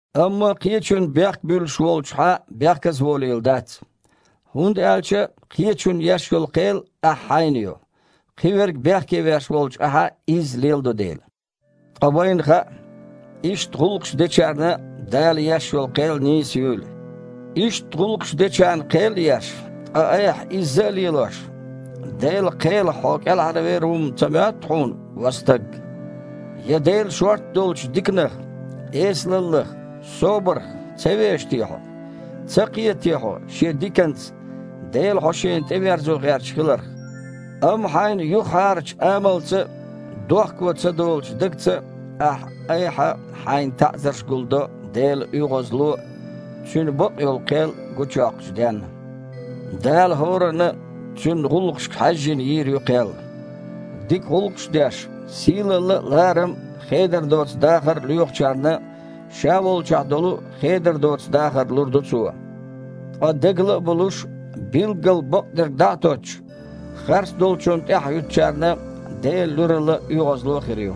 Амма кхечунна бехк буьллуш волчу хьан бехказаволийла дац, хІунда аьлча кхечунна еш йолу кхел ахь хьайна йо, кхиверг бехке веш волчу ахьа а изза леладо дела. Ткъа вайна хаьа, иштта гІуллакхаш дечарна Дала еш йолу кхел нийса юйла. Иштта гІуллакхаш дечарна кхел а еш, ткъа айхьа изза а лелош, Делан кхелах хьо кІелхьарвер ву-м ца моьтту хьуна, ва стаг? Я Делан шортта долчу диканах, эсалаллах, собарх ца веша те хьо? Ца кхета те хьо Шен диканца Дела хьо Шена тІеверзо гІерташ хиларх? Амма хьайн юхахьарачу амалца а, дохко ца долучу дагца а ахьа-айхьа хьайна таІзарш гулдо Делан оьгІазло а, Цуьнан бакъйолу кхел а гучуйоккхучу денна. Дала хІоранна а, цуьнан гІуллакхашка хьаьжжина, йийр ю кхел. Дика гІуллакхаш а деш, сийлалла а, ларам а, хедар доцу дахар а лоьхучарна Ша волчохь долу хедар доцу дахар лур ду Цо. Ткъа дегала а болуш, билггал бакъдерг дІа а тоттуш, харцдолчунна тІаьхьахІуьттучарна Делан луьралла а, оьгІазло а хир ю.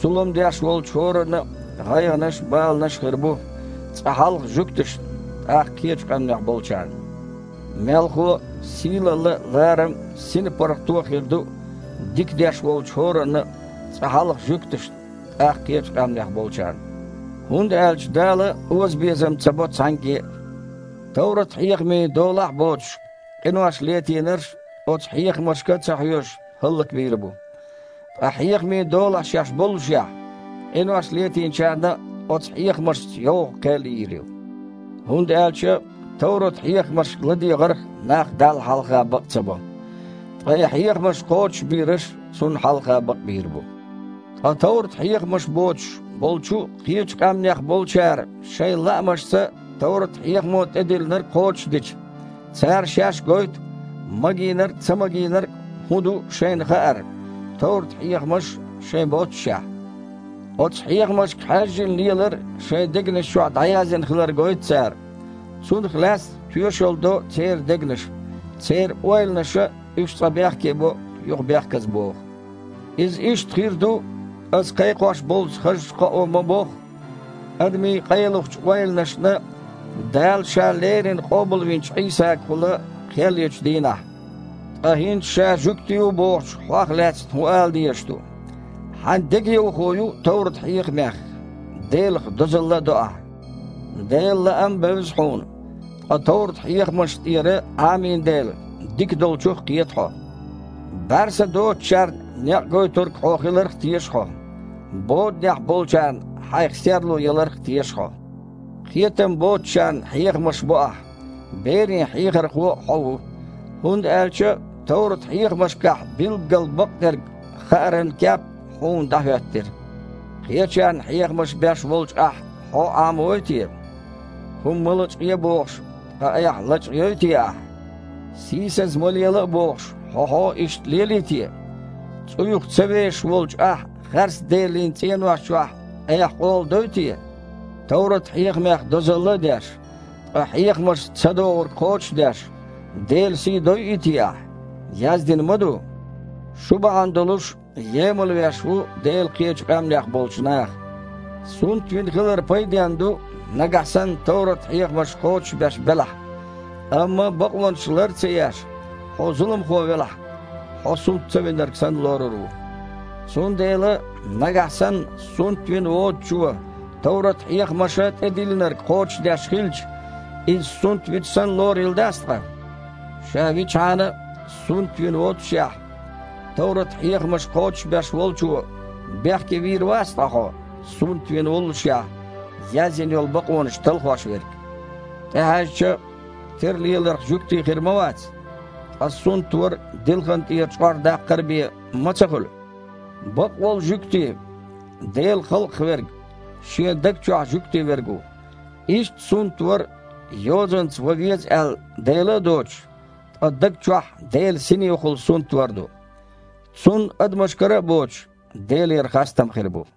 Зулам деш волчу хІоранна а гІайгІанаш а, баланаш а хир бу, цкъа хьалха жуьгташна, тІаккха кхечу къаьмнех болчарна! Мелхо а, сийлалла а, ларам а, синпаргІато а хир ду дика деш волчу хІоранна а, цкъа хьалха жуьгташна, тІаккха кхечу къаьмнех болчарна! ХІунда аьлча Дала озабезам ца бо цхьаьнгге а. Товрат-хьехамийн долахь а боцуш, къинош латийнарш, оцу хьехамашка а ца хьоьжуш, хІаллакбийр бу. Ткъа хьехамийн долахь шаьш боллушехь, къинош летийначарна оцу хьехамашца йоггІу кхел йийр ю. ХІунда аьлча товрат-хьехамашка ладегІарх нах Далла хьалха бакъ ца бо, ткъа и хьехамаш кхочушбийраш Цунна хьалха бакъбийр бу. Ткъа товрат-хьехамаш боцуш болчу кхечу къаьмнех болчара шайн лаамашца товрат-хьехамо тІедиллинарг кхочушдича, цара шаьш гойту, магийнарг а, цамагийнарг а хІун ду шайна хаар, товрат-хьехамаш шайн боццушехь а. Оцу хьехамашка хьаьжжина лелар шайн дегнаш чохь дІаяздина хилар гойту цара. Цунах лаьцна тоьшалла до церан дегнаша. Церан ойланаша уьш цкъа бехке бо, юха бехказабоху. Иза иштта хир ду, аса кхайкхош болчу хазачу кхоо ма-бохху, адамийн къайлахчу ойланашна Дала Ша леррина къобалвинчу Іийсагахула кхел ечу дийнахь. Ткъа хІинца ша жуьгти ву бохучу хьох лаьцна хІун ала дезаш ду? Хьан дегайовхо ю товрат-хьехамех, Делах дозалла а до ахьа. Делан лаам а бевза хьуна, ткъа товрат-хьехамашна тІера Іамийна дела, дика долчух а кхета хьо. БІаьрса доцучарна некъ гойтург хьо хиларх а теша хьо, боданехь болчарна хьайх серло яларх а теша хьо. Кхетам боцучарна хьехамаш бо ахь, берийн хьехархо а хьо ву, хІунда аьлча товрат-хьехамашкахь билггал бакъдерг хааран кеп хьуна дІахІоьттира. Кхечарна хьехамаш беш волчу ахьа хьо Іамавой те? ХІума ма лачкъае а бохуш, ткъа айхьа лечкъайой те ахьа? Сийсаза ма лела а бохуш, хьо-хьо иштта лелий те? ЦІуйх ца вешаш волчу ахьа харцделанийн цІенош чохь айхьа къола дой те? Товрат-хьехамех дозалла а деш, ткъа хьехамашца цадогІург кхочуш а деш, Делан сий дойий те ахьа? Яздина ма ду: «Шу бахьана долуш, емалвеш ву Дела кхечу къаьмнех болчу наха». Сунтвина хилар пайденна ду, нагахь санна товрат-хьехамаш кхочушбеш белахь. Амма бакъонаш лар а ца еш, хьо зуламхо велахь, хьо сунт ца винарг санна лорур ву. Цундела, нагахь санна сунтвина воцучо товрат-хьехамаша тІедиллинарг кхочушдеш хилча, иза сунтвича санна лорийла дац ткъа? Ша вичхьана а сунтвина воццушехь, товрат-хьехамаш кхочушбеш волчо бехке вийр вац ткъа хьо, сунтвина воллушехь, язйина йолу бакъонаш талхош верг? ТІехьаьжча, тера леларх жуьгти хир ма вац, ткъа сунтвар дилхан тІера чкъор даккхар бен ма ца хуьлу. Бакъволу «жуьгти» (Делан халкъах верг) шен даг чохь жуьгти верг ву. Иштта сунтвар – йозанца ван веза аьлла дела а доцуш, ткъа даг чохь Делан Синехула сунтвар ду. Цунна, адамашкара а боцуш, Делера хастам хир бу.